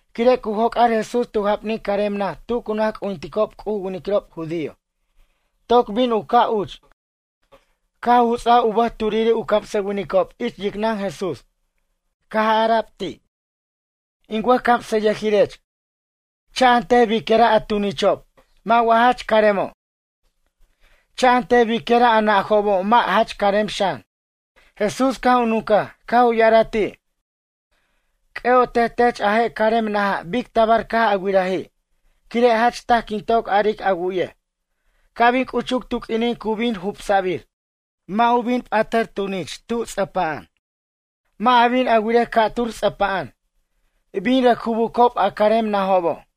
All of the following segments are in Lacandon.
Quire' cu joc'ar Jesús tu japnin carem naj tu cu naj c'ujinticob C'uj u winiquirob judío. Toc bin u caj uch, caj u juts'aj u bʌj turiri' u camsʌwinicob ich yicnʌn Jesús. Ca' ara'b ti': ―In wʌjcamsʌyʌjirech, cha'antej biquira' a tunichob. Mʌ' wa jach caremo'? Cha'antej biquira' a najobo' mʌ' jach carem xan? Jesús caj u nuncaj, caj u ya'araj ti': ―C'ʌ'otej tech a je' carem naja' bic tabar caj a wiraji' quire' jach taj quin toc aric a wu'yej, ca' bin c'uchuc tu q'uinin cu bin jubsa'bir. Mʌ' u p'at tunich tub ts'ʌpa'an, mʌ' a bin a wirej ca'tur ts'ʌpa'an. Bin rʌc jubucob a carem najobo'.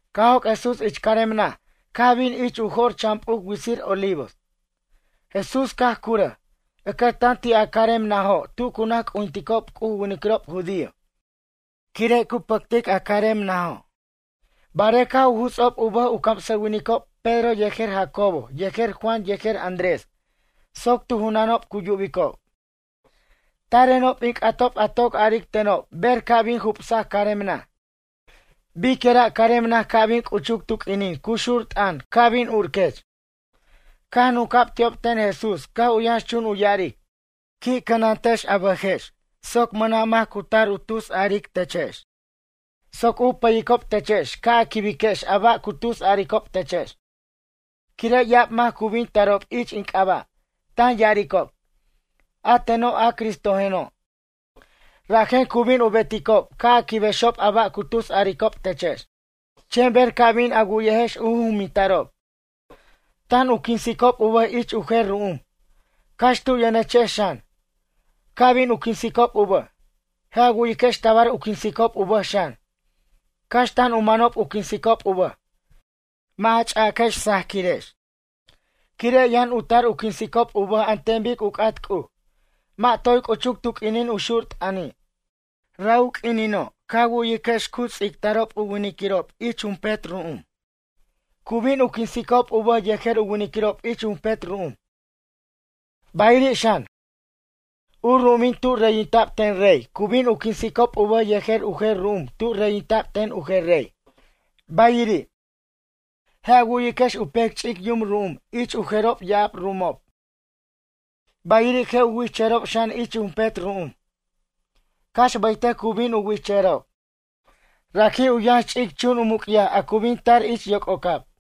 Caj joc' Jesús ich carem naj caj bin ich u jo'r chan p'uc witsir Olivos, Jesús caj curʌj, ʌcʌtan ti' a carem najo' tu cu naj c'ujinticob C'uj u winiquirob judío, quire' cu pʌctic a carem najo', barej caj u juts'ob u bʌj u camsʌwinicob Pedro yejer Jacobo yejer Juan yejer Andrés soc tu junanob cu yubicob: ―Tarenob in c'atob a toc aric tenob ber ca' bin jubsac carem naj? Biquira' carem naj ca' bin c'uchuc tu q'uinin cu xur t'ʌn ca' bin urquech? Caj nunca'b ti'ob ten Jesús caj u yʌnx chun u ya'aric: ―Qui' cʌnantex a bʌjex soc mʌna' mac cu tar u tusaric techex, soc u pʌyicob techex ca' a quibiquex a ba' cu tusaricob techex. Quire' ya'ab mac cu bin tarob ich in c'aba', tan ya'aricob: “A teno' a Cristojeno'.” Rajen cu bin u beticob ca' a quibexob a ba' cu tusaricob techex. Chen ber ca' bin a wu'yejex u juminta'rob: “Tan u quinsicob u bʌj ich u jer ru'um”, cax tu yʌnechex xan, ca' bin u quinsicob u bʌj. Je' a wu'yiquex tabar u quinsicob u bʌj xan. Cax tan u manob u quinsicob u bʌj, mʌ' a ch'aquex sajaquirex, quire' yʌn u tar u quinsicob u bʌj an ten bic u c'at C'uj. Mʌ' toy c'uchuc tu q'uinin u xur t'ʌni'. Ra' u quinino' ca wu'yiquex cu ts'ictarob winiquirob ich jumpet ru'um. Cu bin u quinsicob u bʌj yejer u winiquirob ich jumpet ru'um. Bayiri' xan, u ru'umin tu reyinta'b ten rey cu bin u quinsicob u bʌj yejer u jer ru'um tu reyinta'b ten u jer rey. Bayiri', je' a wu'yiquex u pec ch'ic yum ru'umin ich u jerob ya'ab ru'umob. Bayiri' je' u wichʌjʌrob xan ich jumpet ru'um, cax baytʌc cu bin u wichʌjʌrob. Raji' u yʌnx ch'ic chun u muc'yaj a cu bin tar ich yoc'ocab.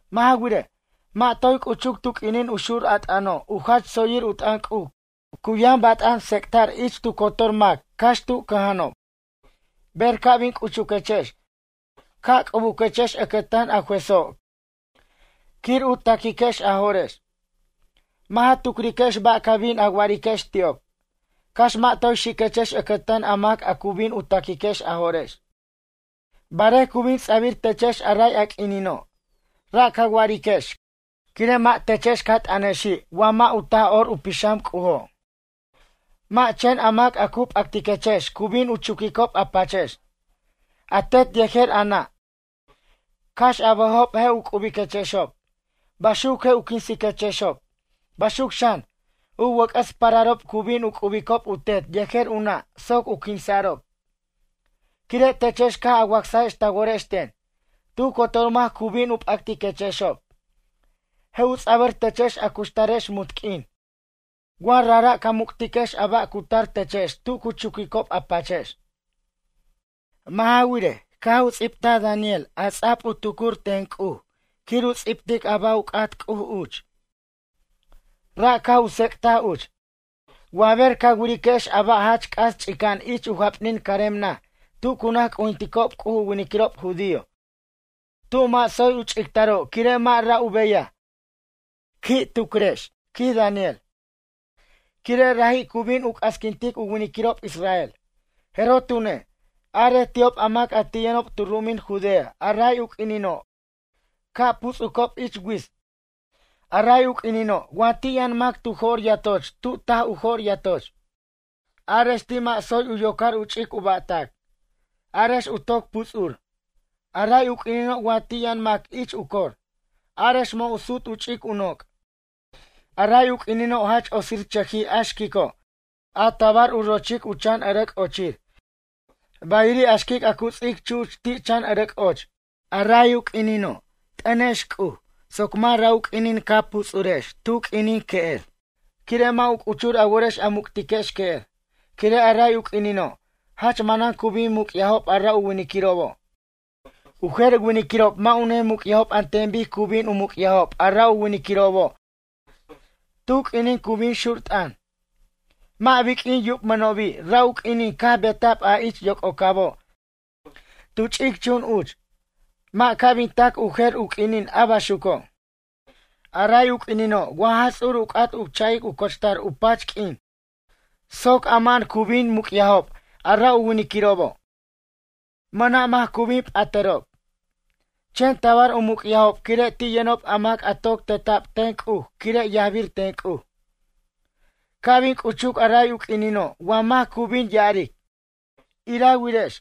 Mʌ' ja wirej, mʌ' toy c'uchuc tu q'uinin u xur a t'ʌno' u jach tsoyir u t'ʌn C'uj cu yʌn bat'an tsec'ta'r ich tu cotor mac cax tu cʌja'anob. Ber ca' bin chucuquechex ca' c'ubuquechex ʌcʌtan a juezo' quir u taquiquex a jo'rex. Mʌ' ja tucriquex ba' ca bin a wa'ariquex ti'ob, cax mʌ' toy xiquechex ʌcʌtan a mac a cu bin u taquiquex a jo'rex. Barej cu bin ts'abir techex a ray a q'uinino', ra' ca wa'ariquex quire' mʌ' techex ca t'ʌnexi' wa mʌ' a Taj'or u Pixam C'ujo'. Mʌ' chen a mac a cu p'actiquechex cu bin u chuquicob a pachex, a tet yejer a nʌ' cax a bʌjob je' u c'ubiquechexob, baxuc je' u quinsiquechexob. Baxuc xan, u wʌc'ʌs pararob cu bin u c'ubicob u tet yejer u nʌ' soc u quinsa'rob. Quire' techex caj a wacsajex ta worex ten, tu cotor mac cu bin u p'actiquechexob, je' u ts'abʌr techex a cuxtarex munt q'uin wa rajra' ca muc'tiquex a ba' cu tar techex tu cu chuquicob a pachex. ’Mʌ' ja wirej, caj u ts'ibtaj Daniel a ts'ab u tucuric ten C'uj quir u ts'ibtic a ba' u c'at C'uj uch. Ra' caj u tsec'taj uch: “Wa ber ca wiriquex a ba' jach c'as ch'ica'an ich u japanin carem naj tu cu naj c'ujinticob C'uj u winiquirob judío tu mʌ' tsoy u ch'ictaro' quire' mʌ' ra' u beyaj. Qui' tucriquex ―quij Daniel―, quire' raji' cu bin u c'asquintic u winiquirob Israel.” Jeroj tune', arej ti'ob a mac a ti' yʌnob tu ru'umin Judea a ray u q'uinino' ca' puts'ucob ich wits. A ray u q'uinino' wa ti' yʌn mac tu jo'r yatoch tu taj u jo'r yatoch. Arex ti' mʌ' tsoy u yocar u ch'ic u ba'tac. Arex u toc puts'ur. A ray u q'uinino' wa ti' yʌn mac ich u cor. Arex mʌ' u sut u ch'ic u noc'. A ray u q'uinino' jach otsirchʌjij a xquico' a tabar u rochic u chan ʌrʌc' ochir. Bayiri' a xquic a cu ts'ic chuch ti' chan ʌrʌc' och. A ray u q'uinino' t'ʌnex C'uj soc mʌ' ra' u q'uinin a puts'urex tu q'uinin que'er, quire' mʌ' a c'uchur a worex a muc'tiquex que'er. Quire' a ray u q'uinino', jach manan cu bin muc'yajob a ra winiquirobo'. U jer winiquirob mʌ' u ne muc'yajob an ten bic cu bin u muc'yajob a ra winiquirobo' tu q'uinin cu bin xur t'ʌn. Mʌ' biq'uin yubmʌnobi' ra u q'uinin caj beta'b a ich yoc'ocabo' tu ch'ic chun uch. Mʌ' ca' bin tac u jer u q'uinin a baxuco'. A ray u q'uinino' wa Jaj Ts'ur u c'at u cha'ic u cochtar u pach q'uin soc ama'an cu bin muc'yajob a ra winiquirobo', mʌna' mac cu bin p'atʌrob. Chen tabar u muc'yajob quire' ti' yʌnob a mac a toc teta'b ten C'uj quire' yajbir ten C'uj. ’Ca' bin c'uchuc a ray u q'uinino' wa mac cu bin ya'aric: “Irewirex,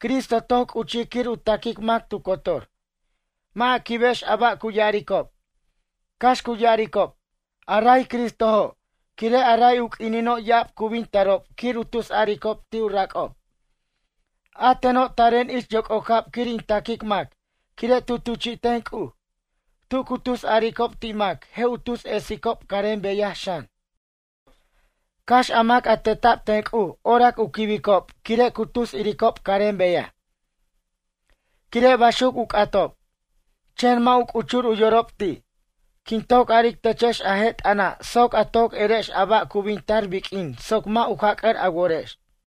Cristo toc c'uchij quir u taquic mac tu cotor.” Mʌ' a quibex a ba' cu ya'aricob. Cax cu ya'aricob: “A ray Cristojo'.” Quire' a ray u q'uinino' ya'ab cu bin tarob quir u tusaricob ti' u rac'ob: “A teno' taren ich yoc'ocab quir in taquic mac, quire' tu tuchi'ten C'uj.” Tu cu tusaricob ti' mac je' u tus esicob carem beyaj xan. Cax a mac a teta'b ten C'uj orac u quibicob quire' cu tus iricob carem beyaj, quire' baxuc u c'atob, chen mʌ' u c'uchur u yorob ti'. Quin toc aric techex a je' t'ʌna' soc a toc erex a ba' cu bin tar biq'uin soc mʌ' u jac'ʌr a worex.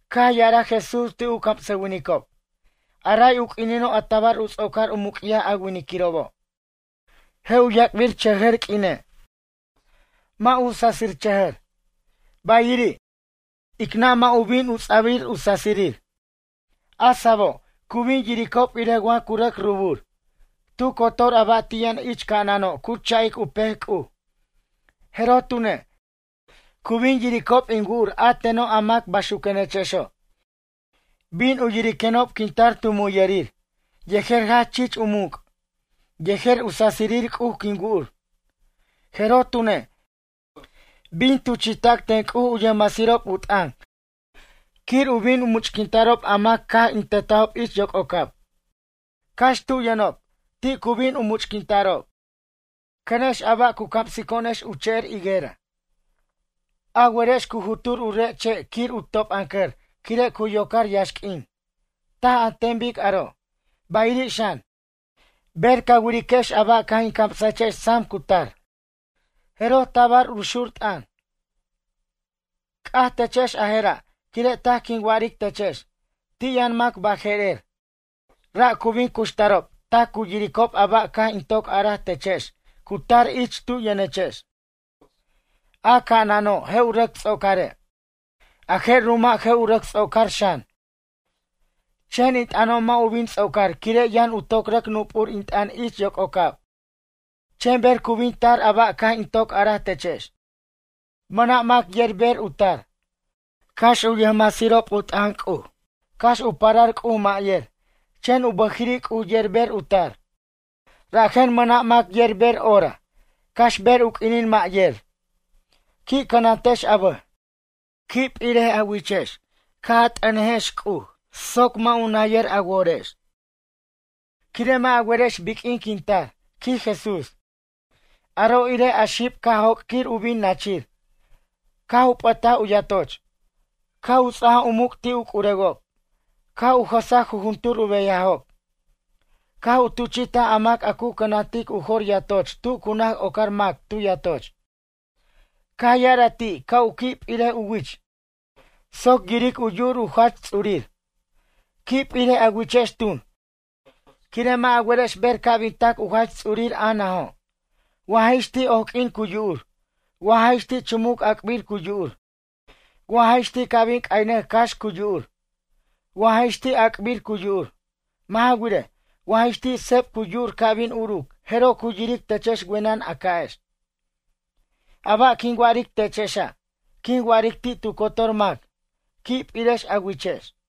Caj ya'araj Jesús ti' u camsʌwinicob: ―A ray u quinino' a tabar u ts'ocar u muc'yaj a winiquirobo'. Je' u yac'birchʌjʌr q'uine'. Mʌ' u sasichʌjʌr. Bayiri', ic nʌ' mʌ' u bin u ts'abir u sasirir. A sa'abo', cu bin yiricob irej wa cu rʌc rubur. Tu cotor ba' a ti' yʌn ich ca'anano' cu cha'ic u pec C'uj. Jeroj tune', cu bin yiricob in wu'ur a teno' a mac bayxuquenechexo'. Bin u yiriquenob quin tar tu muyʌrir yejer jach chich in muc', yejer u sasirir C'uj quin wu'ur. Jeroj tune', bin tuchi'tac ten C'uj u yʌjmasirob u t'ʌn quir u bin u much'quinta'rob a mac caj in tetajob ich yoc'ocab, cax tu yʌnob, ti' cu bin u much'quinta'rob. ’Cʌnex a ba' cu camsico'onex che'er higuera. A werex cu jut'ur u re' che' quir u top'ʌncʌr quire' cu yocar yaxq'uin, taj an ten bic aro'. Bayiri' xan, ber ca wiriquex a ba' caj in camsajechex sam cu tar, jeroj tabar u xur t'ʌn. C'aj techex a jera', quire' taj quin wa'aric techex. Ti' yʌn mac baje'rer, ra' cu bin cuxtarob tac cu yiricob a ba' caj in toc araj techex cu tar ich tu yʌnechex. A ca'anano' je' u rʌc ts'ocare', a je' ru'uma' je' u rʌc ts'ocar xan. Chen in t'ʌno' mʌ' u bin ts'ocar quire' yʌn u toc rʌc nupur in t'ʌn ich yoc'ocab. ’Chen ber cu bin tar a ba' caj in toc araj techex, mʌna' mac yer ber u tar. Cax u yʌjmasirob u t'ʌn C'uj, cax u parar C'uj mʌ' yer, chen u bʌjiri' C'uj yer ber u tar. Rajen mʌna' mac yer ber hora, cax ber u q'uinin mʌ' yer. ’Qui' cʌnatex a bʌj, qui' p'iric a wichex ca' a t'ʌnejex C'uj soc mʌ' u nayʌr a worex. Quire' mʌ' a werex biq'uin quin tar ―quij Jesús―. Aro' irej a xib a caj joc' quir u bin nachir. Caj u p'ʌtaj u yatoch, caj u ts'ajaj u muc' ti' u c'urewob, caj u jʌsaj jujuntur u beyajob, caj u tuchi'taj a mac a cu cʌnantic u jor yatoch tu cu naj ocar mac tu yatoch, caj ya'araj ti' ca' u qui' p'irej u wich soc yiric u yu'ur u jach ts'urir. Qui' p'irej a wichex tun, quire' mʌ' a werex ber ca' bin tac u jach ts'urir a najo', wa jix ti' oq'uin cu yu'ur, wa jix ti' chumuc ac'bir cu yu'ur, wa jix ti' ca' bin c'ayʌnʌc cax cu yu'ur, wa jix ti' a'a'cbir cu yu'ur. Mʌ' ja wirej, wa jix ti' seb cu yu'ur ca' bin uruc jeroj cu yiric techex wenʌn a ca'ex. A ba' quin wa'aric techexa', quin wa'aric ti' tu cotor mac: “Qui' p'irex a wichex.”